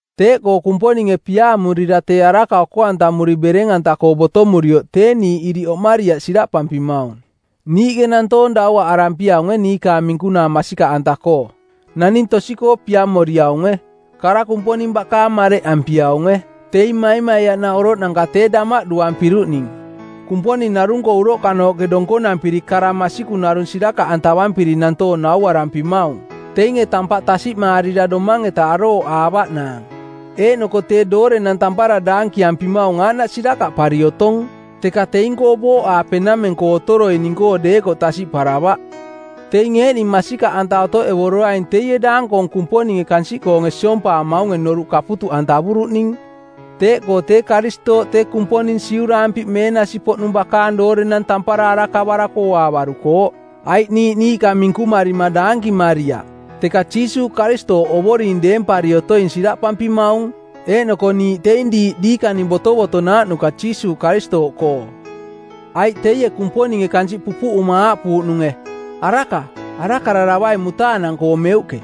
Teeꞌkoo Kumponinge piaamurira tee araka oko-antamuri bereng-anta-koo botomurioꞌ tee niiꞌ iriꞌ oꞌmariaꞌ siraꞌpampimaung. Niiꞌke nantoong dauaꞌarampiaunge niikaang minkunaa masikaꞌanta-koo. Naning tosi-koo piamoriaunge. Kara Kumponing bakaang mareꞌampiaunge. Teing maimaiaꞌnaꞌ oroꞌnanka tee damaꞌduampiruꞌning. Kumponing narung-koo uroꞌkanooꞌke donkonampiri kara masikung narung sirakaꞌantavampiri nantoong nauarampimaung teinge tampaꞌ tasiꞌmaarira domang-eta arooꞌaavaꞌnaang. Eeꞌnoko tee doorenang tampara daankiampimaung aaꞌnaꞌ sirakaꞌpari otong, teka teing-koo booꞌaape nameng-koo otoroining-koo deekoꞌ tasiꞌparavaꞌ. Teing eeꞌning masikaꞌanta otoꞌevoroaing teie daang-koong kumponinge kansiꞌkoonge siompaamaunge noruꞌ kaputuꞌantavuruꞌning. Teeꞌkoo tee Karistooꞌ tee Kumponing siuraampi˜ meenasi-poꞌnung bakaang doorenang tampara arakavarako ooaavarukooꞌ. Aiꞌ niiꞌ niiꞌka minkumarima daankimariaꞌ, teka Jiisuuꞌ Karistooꞌ Ovoring deempari otoing siraꞌpampimaung, eeꞌnoko niiꞌ teing diiꞌ diikaning botovotonaaꞌnuka Jiisuuꞌ Karistooꞌkoo. Aiꞌ teie Kumponinge kansiꞌ pupuꞌuma aaꞌpuuꞌnunge, “Araka, arakararavai mutaanang-koo meuꞌke,”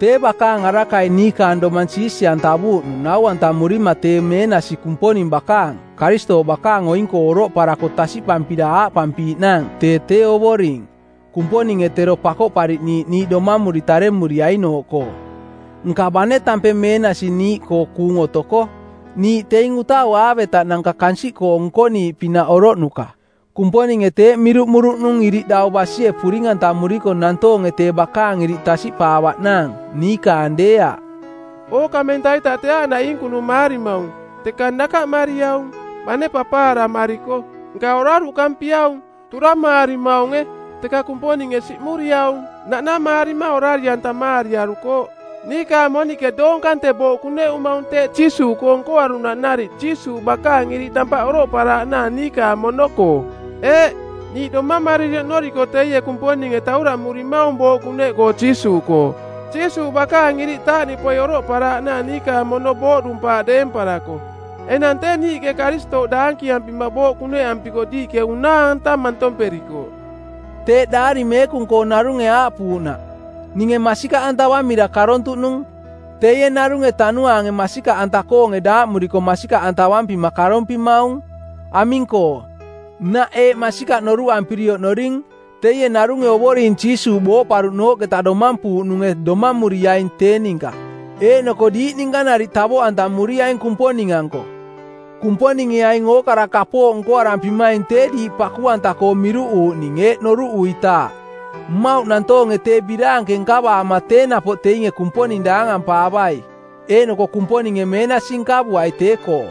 tee bakaang arakai niikaang domang siisi-antavuuꞌnung nau-antamurima tee meenasi Kumponing bakaang, Karistooꞌ bakaang oing-koo oroꞌparako tasiꞌpampira aaꞌpampiiꞌnaang tee tee Ovoring, Kumponinge tero Pakoꞌpariꞌniiꞌ niiꞌ domamuri taremuriainooꞌkoo. Nka bane tampeng meenasi niiꞌkoo kuung otoko, niiꞌ teing utau aavetaꞌnanka kansiꞌkoo nkoniiꞌpinaꞌ oroꞌnuka. Kumponinge teeꞌ miruꞌmuruꞌnung iriꞌ dau basie puring-antamuriko nantoonge tee bakaang iriꞌ tasiꞌpaavaꞌnaang, niikaang deeaꞌ. Ookamenta-ita tee aaꞌnaꞌ iinkunumaarimaung, teka nakaꞌmariaung. Bane papaaramariko, nka oraruꞌkampiaung. Turamaarimaunge, teka Kumponinge siꞌmuriaung. Naꞌnamaarima orari-antamaariarukooꞌ. Niikaang moniꞌke doong kante booꞌ kuneꞌumaung teeꞌ Jiisuuꞌkoo nkoaruꞌnaꞌ nariꞌ Jiisuuꞌ bakaang iriꞌ tampaꞌ oroꞌparaaꞌnaang niikaang mono-koo. Eeꞌ, niiꞌ domamariri oꞌnoriko teie Kumponinge tauraꞌmurimaung booꞌ kuneꞌkoo Jiisuuꞌkoo, Jiisuuꞌ bakaang iriꞌ taaꞌniꞌpoi oroꞌparaaꞌnaang niikaang mono booꞌdumpaaꞌ deemparako. Enang tee niiꞌke Karistooꞌ daankiampima booꞌ kuneꞌampiko diiꞌke unaa-anta mantomperikooꞌ. Teeꞌ Daari Meekung-koo narunge aaꞌpuuꞌnaꞌ, “Ninge masikaꞌantavamira karontuꞌnung,” teie narunge Tanuaange masikaꞌanta-koonge daaꞌmuriko masikaꞌantavampima karompimaung. Aming-koo, nnaꞌ eeꞌ masikaꞌ noruꞌampiri oꞌnoring, teie narunge Ovoring Jiisuuꞌ booꞌparuꞌnooꞌketa domampuuꞌnunge domamuriaing tee ninka, eeꞌnoko diiꞌ ninka nariꞌ tavoꞌantamuriaing Kumponing-anko. Kumponinge aing ookara kapooꞌ nkoarampimaing tee diiꞌ paku-anta-koo miruꞌuuꞌning eeꞌ noruꞌuitaaꞌ: mmauꞌ nantoonge tee biraanke nkavaama tee napoꞌ teinge Kumponing daangampaavai, eeꞌnoko Kumponinge meenasi nkavuai tee-koo.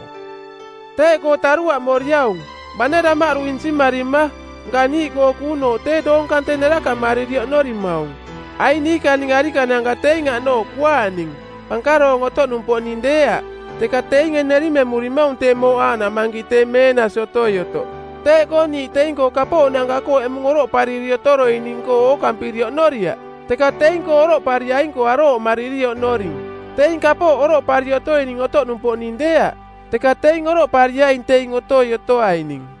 Teeꞌkoo taruaꞌmoriaung. Bane damaꞌdu insimarima, nka niiꞌkoo kuunooꞌ tee doong kante nerakaꞌmariri oꞌnorimaung. Aing niikaning arikananka teing aꞌnooꞌ kuaaꞌning, pankaroong otoꞌnumpoꞌning deeaꞌ, teka teinge nerimemurimaung tee mooꞌ aaꞌnaꞌ mankiꞌ tee meenasi otoi otoꞌ. Teeꞌkoo niiꞌ teing-koo kapooꞌnanka-koo eꞌmung oroꞌpariri otoroining-koo ookampiri oꞌnoriaꞌ, teka teing-koo oroꞌpariaing-koo arooꞌmariri oꞌnoring. Teing kapooꞌ oroꞌpari otoining otoꞌnumpoꞌning deeaꞌ, teka teing oroꞌpariaing teing otoi otoaining.